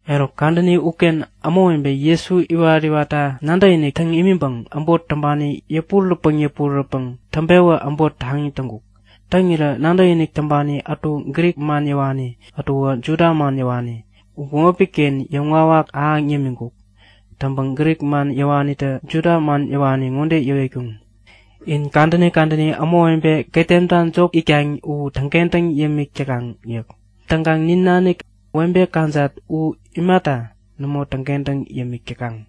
Eruk kadäni uken ämawebe Jesu iwaräntäkta nadäkinik täŋ imiŋpäŋ äbot täŋpani yäpurärätpäŋ yäpurärätpäŋ it-pewä äbot taŋi täŋkuk. Täŋirä nadäkinik täŋpani ätu Grik man yäwani, ätuwä Juda man yäwani u bämopi-ken yäŋwawak ahäŋ yämiŋkuk. Täŋpäŋ Grik man yäwanitä Juda man yäwani ŋode yäwetkuŋ; In kadäni kadäni ämawebe ketemta jop it täkaŋ u täŋkentäŋ yämik täkaŋ yäk. Täŋkaŋ nin nanik webe kajat u imata nämo täŋkentäŋ yämik täkaŋ?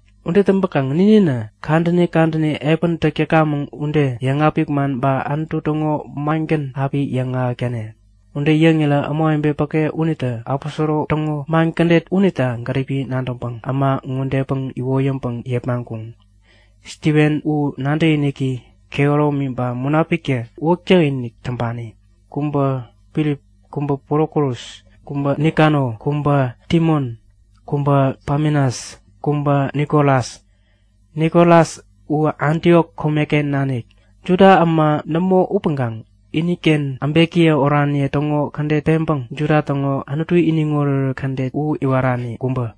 Ude täŋpäkaŋ nininä kadäni kadäni epän täk täkamäŋ ude, yäŋapik man ba Anutu täŋo mangän api yäŋahäk täne. Ude yäŋirä ämawebe päke unitä aposoro täŋo man kädet unita gäripi nadäŋpäŋ äma ŋodepäŋ iwoyäŋpäŋ yepmaŋkuŋ; Stiven, u nadäkiniki kehäromi ba Munapiktä uwäk täkinik täŋpani. Kubä Filip, kubä Prokorus, kubä Nikano, kubä Timon, kubä Pamenas, kubä Nikolas. Nikolas u Antiok komeken nanik, Juda äma nämo upäŋkaŋ iniken äbekiye oraniye täŋo kädet peŋpäŋ Juda täŋo Anutu iniŋ oretoret kädet u iwarani kubä.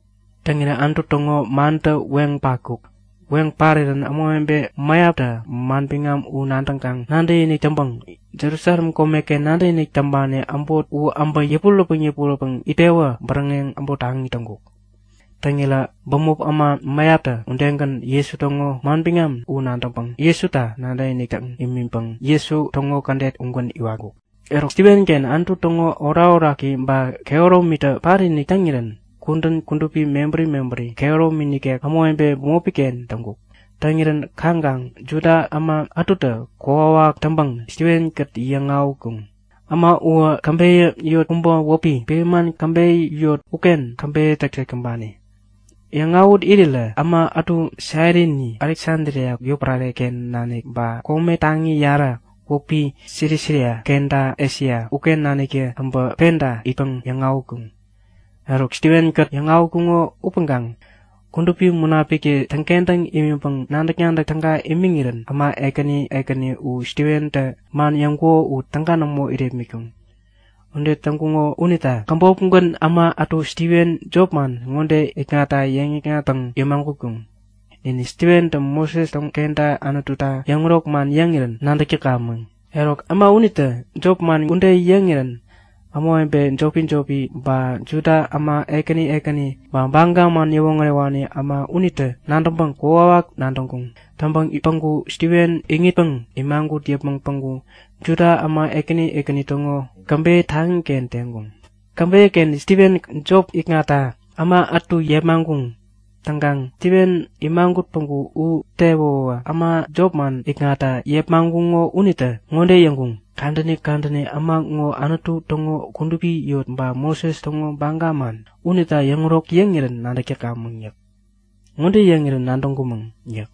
Täŋirä Anutu täŋo mantä weŋ patkuk. Weŋ parirän ämawebe mäyaptä manbiŋam u nadäŋkaŋ nadäkinik täŋpäŋ Jerusalem komeken nadäkinik täŋpani äbot u äbä yäpurärätpäŋ yäpurärätpäŋ it-pewä bäräŋeŋ äbot taŋi täŋkuk. Täŋirä bämop äma mäyaptä udegän Jesu täŋo manbiŋam u nadäŋpäŋ Jesuta nadäkinik täŋ imiŋpäŋ Jesu täŋo kädet ugän iwatkuŋ. Eruk Stivenken Anutu täŋo orakoraki ba kehäromitä patinik täŋirän kudän kudupi mebäri mebäri kehäromi nikek ämawebe bämopi-ken täŋkuk. Täŋirän kaŋkaŋ Juda äma ätutä kokwawak täŋpäŋ Stiven-kät yäŋ-awätkuŋ. Äma uwä käbeyä yot kubä wäpi Friman käbeyä yot uken käbeyä täk täŋpani. Yäŋawät irirä äma ätu Sairini, Aleksadria yotpärare-ken nanik ba kome taŋi yarä wäpi Silisia kenta Esia uken naniktä äbä penta itpäŋ yäŋ-awätkuŋ. Eruk, Stiven-kät yäŋawätkuŋo upäŋkaŋ Kudupi Munapiktä täŋkentäŋ imiŋpäŋ nadäk-nadäk täga imiŋirän äma ekäni ekäni u Stiventä man yäŋkuko u täga nämo irepmitkuŋ. Ude täŋkuŋo unita käbopgän äma ätu Stiven jopman ŋode ikŋatta yäŋ-yäkŋatpäŋ yämagutkuŋ; Nin Stiventä Moses kenta Anututa yäŋärok man yäŋirän nadäk täkamäŋ. Eruk äma unitä jopman ude yäŋirä ämawebe jopi-jopi, ba Juda äma ekäni ekäni ba Baga man yäwoŋärewani äma unitä nadäŋpäŋ kokwawak nadäŋkuŋ. Täŋpäŋ päŋku Stiven iŋitpäŋ imagut yäpmäŋ päŋku Juda äma ekäni ekäni täŋo käbeyä taŋiken teŋkuŋ. Käbeyä-ken Stiven jop ikŋatta äma ätu yepmaŋkuŋ. Täŋkaŋ Stiven imagut päŋku u tewäwä äma jopman ikŋatta yepmaŋkuŋo unitä ŋode yäŋkuŋ; Kadäni kadäni äma ŋo Anutu täŋo kudupi yot ba Moses täŋo baga man unita yäŋärok yäŋirän nadäk täkamäŋ yäk. Ŋode yäŋirän nadäŋkumäŋ yäk;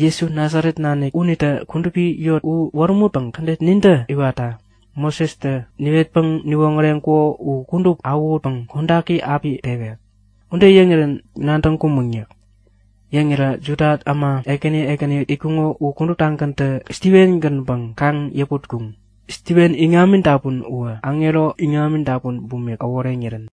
Jesu Nasaret nanik unitä kudupi yot u wärämutpäŋ kädet nintä iwatta Mosestä niwetpäŋ niwoŋäreŋkuko u kudup awähutpäŋ kodaki api pewek. Ude yäŋirän nadäŋkumäŋ yäk. Yäŋirä Juda äma ekäni ekäni itkuŋo u kuduptagäntä Stiven-gänpäŋ kaŋ-yäputkuŋ; Stiven iŋami dapun uwä aŋero iŋam dapun bumik äworeŋirän.